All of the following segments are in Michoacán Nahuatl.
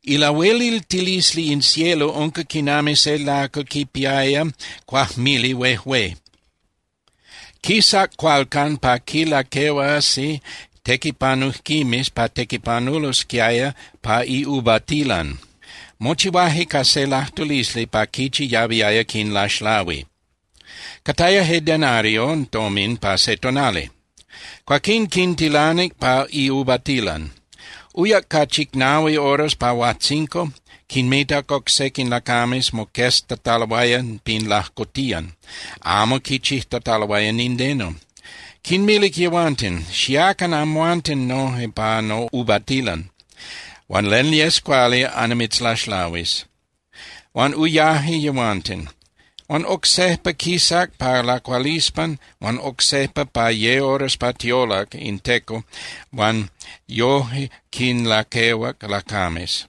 ’Ilahueliltilisli in cielo unca quinami se lacal quipiaya cuajmili huejué. Quisac cualcan pa quinlaquehuasi tequipanujquimes pa tequipanulosquiaya pa iuvatilan. Mochihuaje ca se lajtulisli pa quichi yahuiaya quinlaxlahui. Cataya je denario tomin pa se tonali. Cuaquín quintilanic pa iuvatilan. Uyac pa chicnahui horas pa huajtzinco, quinmitac oc sequin lacames moqueztataloaya pin lajcotiyan, amo quichijtataloaya nindeno. Quinmilic yehuanten: “Xiacan amhuanten noje pa nouvatilan, huan len yes cuali annimitzlaxlahuis.” Huan uyaje yehuanten. Huan oc sejpa quisac pa lacualispan huan oc sejpa pa ye horas pa tiolac in teco huan yoje quinlaquehuac lacames.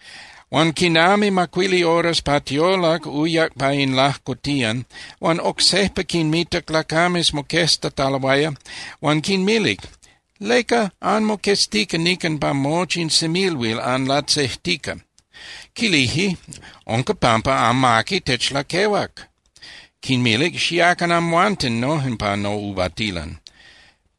Huan quinami macuili horas pa tiolac uyac pa in lajcotiyan huan oc sejpa quinmitac lacames moqueztataloaya huan quinmilic: “¿Leca anmoqueztica nican pa mochi in semilhuil anlatzejtica?” Quilije: “Unca pampa amaqui techlaquehuac.” Quinmilic: “Xiacan amhuanten noje pa nouvatilan.”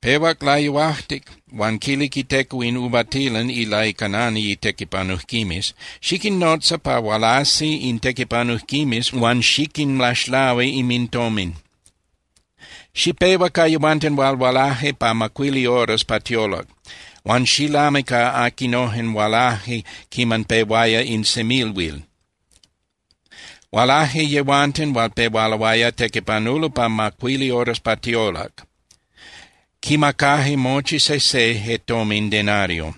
Pehuac layuajtic, huan quilic iteco in uvatilan ilaicanani itequipanujquimes: “Xiquinnotza pa hualasi in tequipanujquimes huan xiquinlaxlahui inmintomin. Xipehua ca yehuanten hual hualaje pa macuili horas pa tiolac huan xilami ca aquinojen hualaje quiman pehuaya in semilhuil.” Hualaje yehuanten hual pehualoaya tequipanulo pa macuili horas pa tiolac, quinmacaje mochi sejse je tomin denario.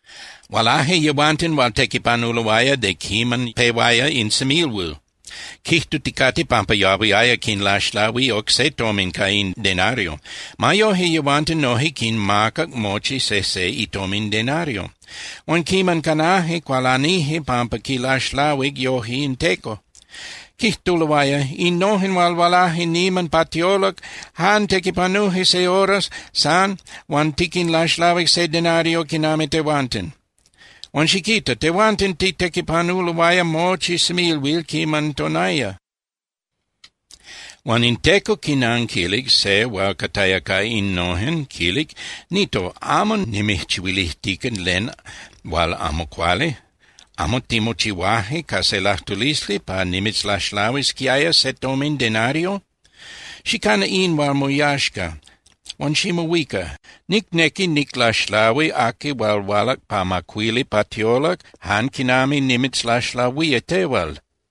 Hualaje yehuanten hual tequipanuloaya de quiman pehuaya in semilhuil quijtuticate pampa yahuiaya quinlaxlahui oc se tomin ca in denario. Ma yoje, yehuanten noje quinmacac mochi sejse itomin denario. Huan quiman canaje, cualanije pampa quinlaxlahuic yoje in teco. Quijtuloaya: “Innojen hual hualaje niman pa tiolac jan tequipanuje se hora san huan tiquinlaxlahuic se denario quinami tehuanten. Huan xiquita. Tehuanten titequipanuloaya mochi semilhuil quiman tonaya.” Huan in teco quinanquilic se hual cataya ca innojen, quilic: “Nito, amo nimijchihuilijtica len hual amo cuali. ¿Amo timochihuaje ca se lajtulisli pa nimitzlaxlahuisquiaya se tomin denario? Xicana in hual moyaxca huan ximohuica. Nicnequi niclaxlahui aqui hual hualac pa macuili pa tiolac jan quinami nimitzlaxlahuía tehual.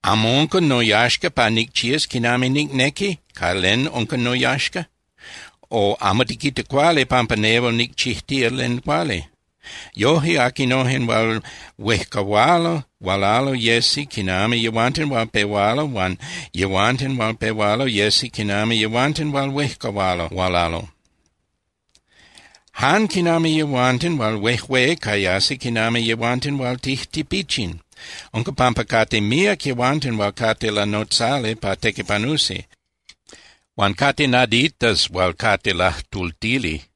¿Amo unca noyaxca pa nicchías quinami nicnequi ca len unca noyaxca? O ¿amo tiquita cuali pampa nehual nicchijtica len cuali?” Yoje aquinojen hual huejcahualo hualalo yesi quinami yehuanten hual pehualo huan yehuanten hual pehualo yesi quinami yehuanten hual huejcahualo hualalo, jan quinami yehuanten hual huejué cayasi quinami yehuanten hual tijtipichin. Unca pampa cate míac yehuanten hual cate lanotzali pa tequipanusi, huan cate naditas hual cate lajtultili.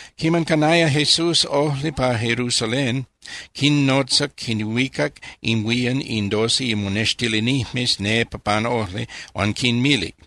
Quiman canaya Jesús ojli pa Jerusalén, quinnotzac quinhuicac inhuían in doce imonextilinijmes nepa pan ojli huan quinmilic: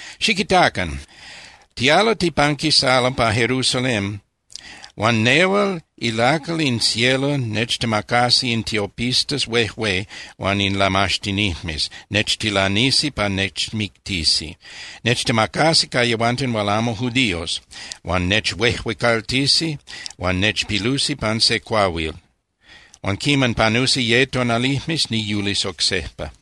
—Xiquitacan. Tialo pa Jerusalén huan nehual ilacal in cielo nechtemacasi in tiopistas huejué huan in lamaxtinijmes, nechtilanisi pa nechmictisi. Nechtemacasi ca yehuanten hual amo judíos, huan nechhuejuecaltisi huan nechpilusi pan se cuahuil. Huan quiman panusi ye tonalijmes niyulis oc sejpa.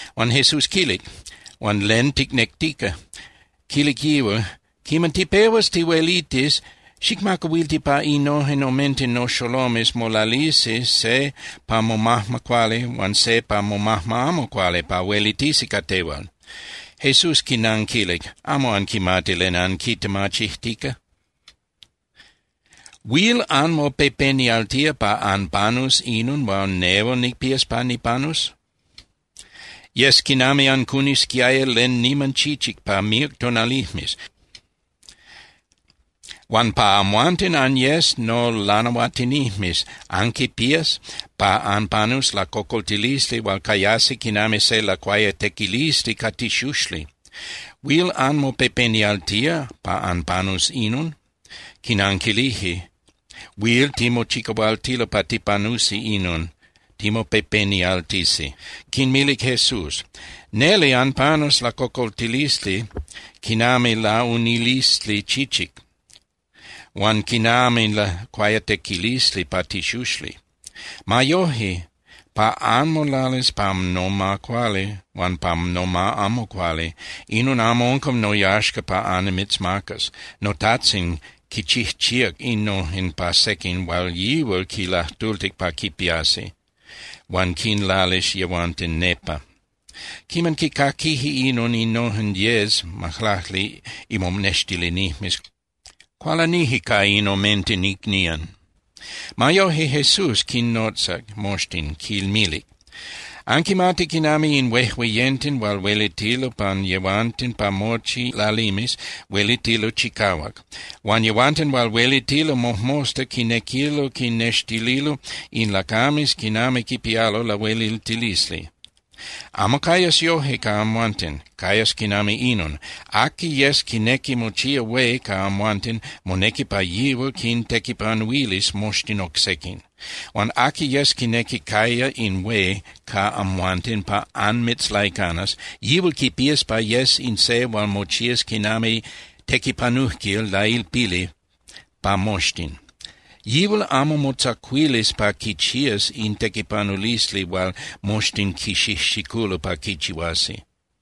Huan Jesús quilic: —Huan ¿len ticnectica? Quilic yihual: —Quiman tipehuas tihuelitis, xicmacahuilti pa innojen omenten noxolomes molalisi se pa momajma cuali huan se pa momajma amo cuali pa huelitisi ca tehual. Jesús quinanquilic: —Amo anquimati len anquitemachijtica. ¿Huil anmopepenialtía pa anpanus inon hual nehual nicpías pa nipanus? Yes quinami ancunisquiaya len niman chichic pa míac tonalijmes. Huan pa amhuanten anyes nolanahuatinijmes anquipías pa anpanus lacocoltilisli hual cayasi quinami se lacuayatequilisli ca tixuxli. ¿Huil anmopepenialtía pa anpanus inon? Quinanquilije: —Huil timochicahualtilo pa tipanusi inon, timopepenialtisi. Quinmilic Jesús: —Neli anpanus lacocoltilisli quinami launilisli chichic huan quinami lacuayatequilisli pa tixuxli. Ma yoje, pa anmolalis pa noma cuali huan pa noma amo cuali, inon amo unca noyaxca pa annimitzmacas. NoTajtzin quichijchíac innojen pa sequin hual yihual quinlajtultic pa quipiasi, huan quinlalis yehuanten nepa. Quiman quicaquije inon innojen diez (majlacli) imonextilinijmes, cualanije ca in omenten icnían. Ma yoje, Jesús quinnotzac moxtin, quinmilic: —Anquimati quinami in huejueyenten hual huelitilo pan yehuanten pa mochi lalimes, huelitilo chicahuac. Huan yehuanten hual huelitilo mojmosta quinequilo quinnextililo in lacames quinami quipialo lahueliltilisli. Amo cayas yoje ca amhuanten, cayas quinami inon: Aqui yes quinequi mochía hué ca amhuanten, monequi pa yihual quintequipanuilis moxtin oc sequin. Huan aqui yes quinequi caya in hué ca amhuanten pa anmitzlaicanas, yihual quipías pa yes in se hual mochías quinami tequipanujquil lailpili pa moxtin. Yihual amo motzacuilis pa quichías in tequipanulisli hual moxtin quixijxiculo pa quichihuasi.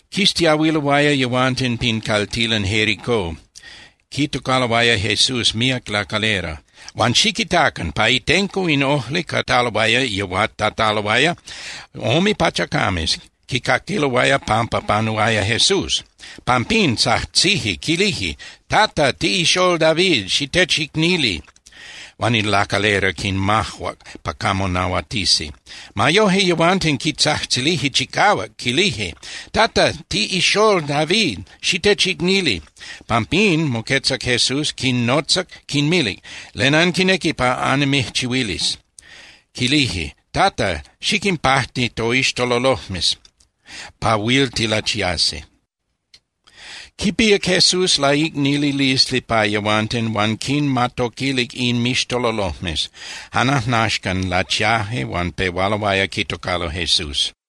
Quistiahuiloaya yehuanten pin caltilan Jericó, quitocaloaya Jesús míac lacalera. Huan xiquitacan, pa itenco in ojli cataloaya yehuatataloaya ome pachacames, quicaquiloaya pampa panuaya Jesús. Pampín tzajtzije, quilije: —¡Tata, tiꞌixól David, xitechicnili! Huan in lacalera quinmajuac pa camo nahuatisi. Ma yoje, yehuanten quitzajtzilije chicahuac, quilije: —¡Tata, tiꞌixól David, xitechicnili! Pampín, moquetzac Jesús, quinnotzac, quinmilic: —¿Len anquinequi pa annimijchihuilis? Quilije: —Tata, xiquinpajti toixtololojmes pa huil tilachiasi. Quipíac Jesús laicnililisli pa yehuanten, huan quinmatoquilic inmixtololojmes. Jan ajnaxcan lachiaje huan pehualoaya quitocalo Jesús.